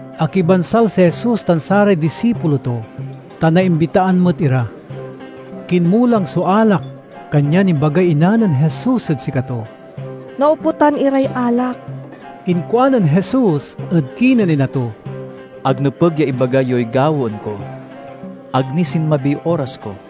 Akibansal si Jesus tan saray disipulo to, ta naimbitaan met ira. Kinmulang so alak kanyan imbagay ina nen Jesus ed sikato, "Naoputan iray alak." Inkuanen Jesus ed kinen ina to, "Ag nepeg ya ibaga yoy gawaen ko. Ag ni sinmabiy oras ko."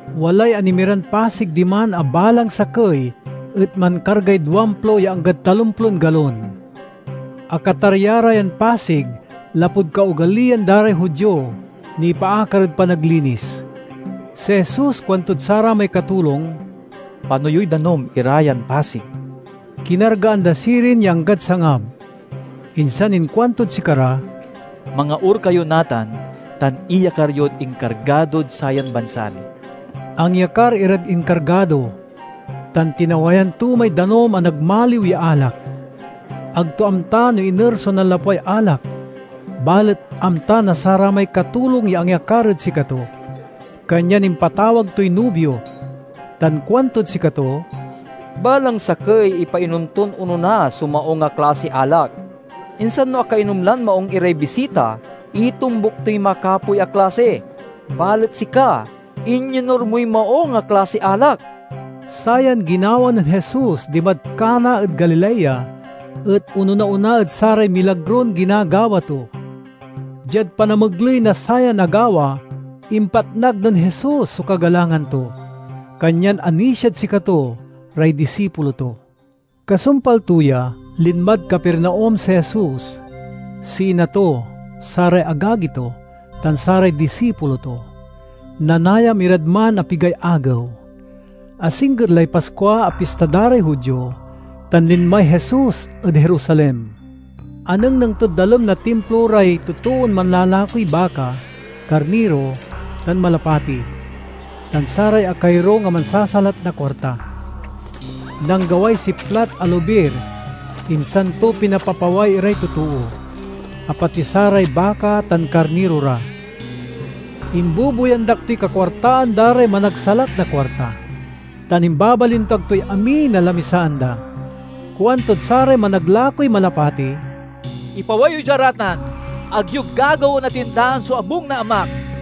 Walay anemiran pasig diman a balang sakey et mankargay duamplo ya anggad talomplon galon. Akatarya ra yan pasig lapud kaogaliyan da ray Judio nipaakar ed panaglinis. Si Jesus kuantod saramay katulong, "Pano yoy danum ira yan pasig." Kinargaan da ra sirin ya anggad sangab. Insan inkuantod sikara, "Mangaur kayo natan tan iyakar yod inkargadod sayan bansal." Angyakar irad inkargado tan tinawayan to may danum a nagmaliw ya alak. Ag to amta no iner so nanlapway alak, balet amta na saramay katulong ya angyakar ed sikato, kanyan impatawag toy nubio tan kuantod sikato, "Balang sakey ipainom ton onona so maung a klasiy alak, insan no akainom lan maung iray bisita, itombuk toy makapoy a klasi. Balet, sika, inyonur moy maung a klasiy alak." Sayan ginawa nen Jesus dimad Cana ed Galilea et onona-ona ed saray milagron ginagawa to. Diad panamegley na sayan agawa impatnag nen Jesus so kagalangan to, kanyan anisiad sikato ray disipulo to. Kasumpal to ya, linmad Capernaum si Jesus, si ina to, saray agagi to, tan saray disipulo to. Nanayam irad man a pigay agew. Asingger lay Paskua a Pista da ray Judio, tan linmay Jesus ed Jerusalem. Anengneng tod dalem na Timplo ray totoon manlalakoy baka, karniro, tan malapati, tan saray akayorung a mansasalat na kuarta. Nanggaway siplat a lobir insan to pinapapaway iray totoo, a pati saray baka tan karniro ra. Imbubuyandak toy kakuartaan da ray managsalat na kuarta tan imbabalintuag toy amin a lamisaan da. Kuantod saray managlakoy malapati, "Ipaway yo dia ra tan! Ag yo gagawaen a tindaan so abung na Amak!"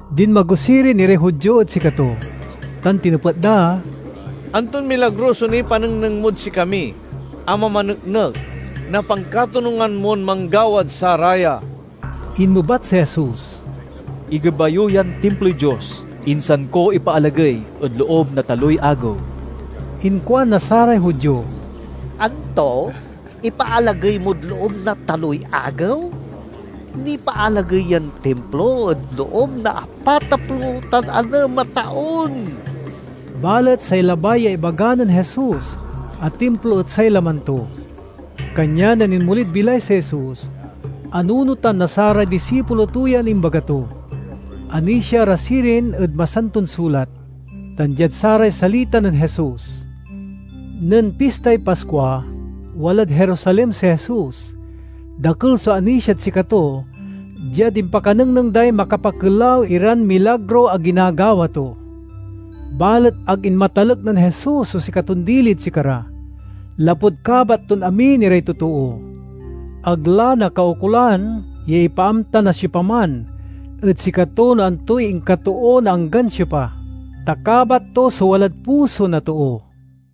Dinmago sirin iray Judio ed sikato tan tinepet da, "Anton milagro so nipanengneng mod sikami a mamaneknek na pankatonungan mon manggawad saraya?" Inmebat si Jesus, "Igeba yo yan Timploy Dios, insan ko ipaalagey ed loob na taloy agew." Inkuan na saray Judio, "Anto, ipaalagey mod loob na taloy agew? Nipaalagey yan Timplo ed loob na apataplo tan anem a taon!" Balet say labay ya ibaga nen Jesus a Timplo et say laman to. Kanyan nen inmolid bilay si Jesus, anunotan na saray disipulo to yan imbaga to. Anisia ra sirin ed Masanton Sulat tan diad saray salita nen Jesus. Nen Pistay Paskua, walad Jerusalem si Jesus. Dakel so anisiad sikato diad impakanengneng day makapakelaw iran milagro a ginagawa to. Balet ag inmatalek nen Jesus so sikaton dili ed sikara, lapud kabat ton amin iray totoo. Ag la nakaukolan ya ipaamta na siopaman ed sikato no antoy inkatoo na anggan siopa, ta kabat to so walad puso na too.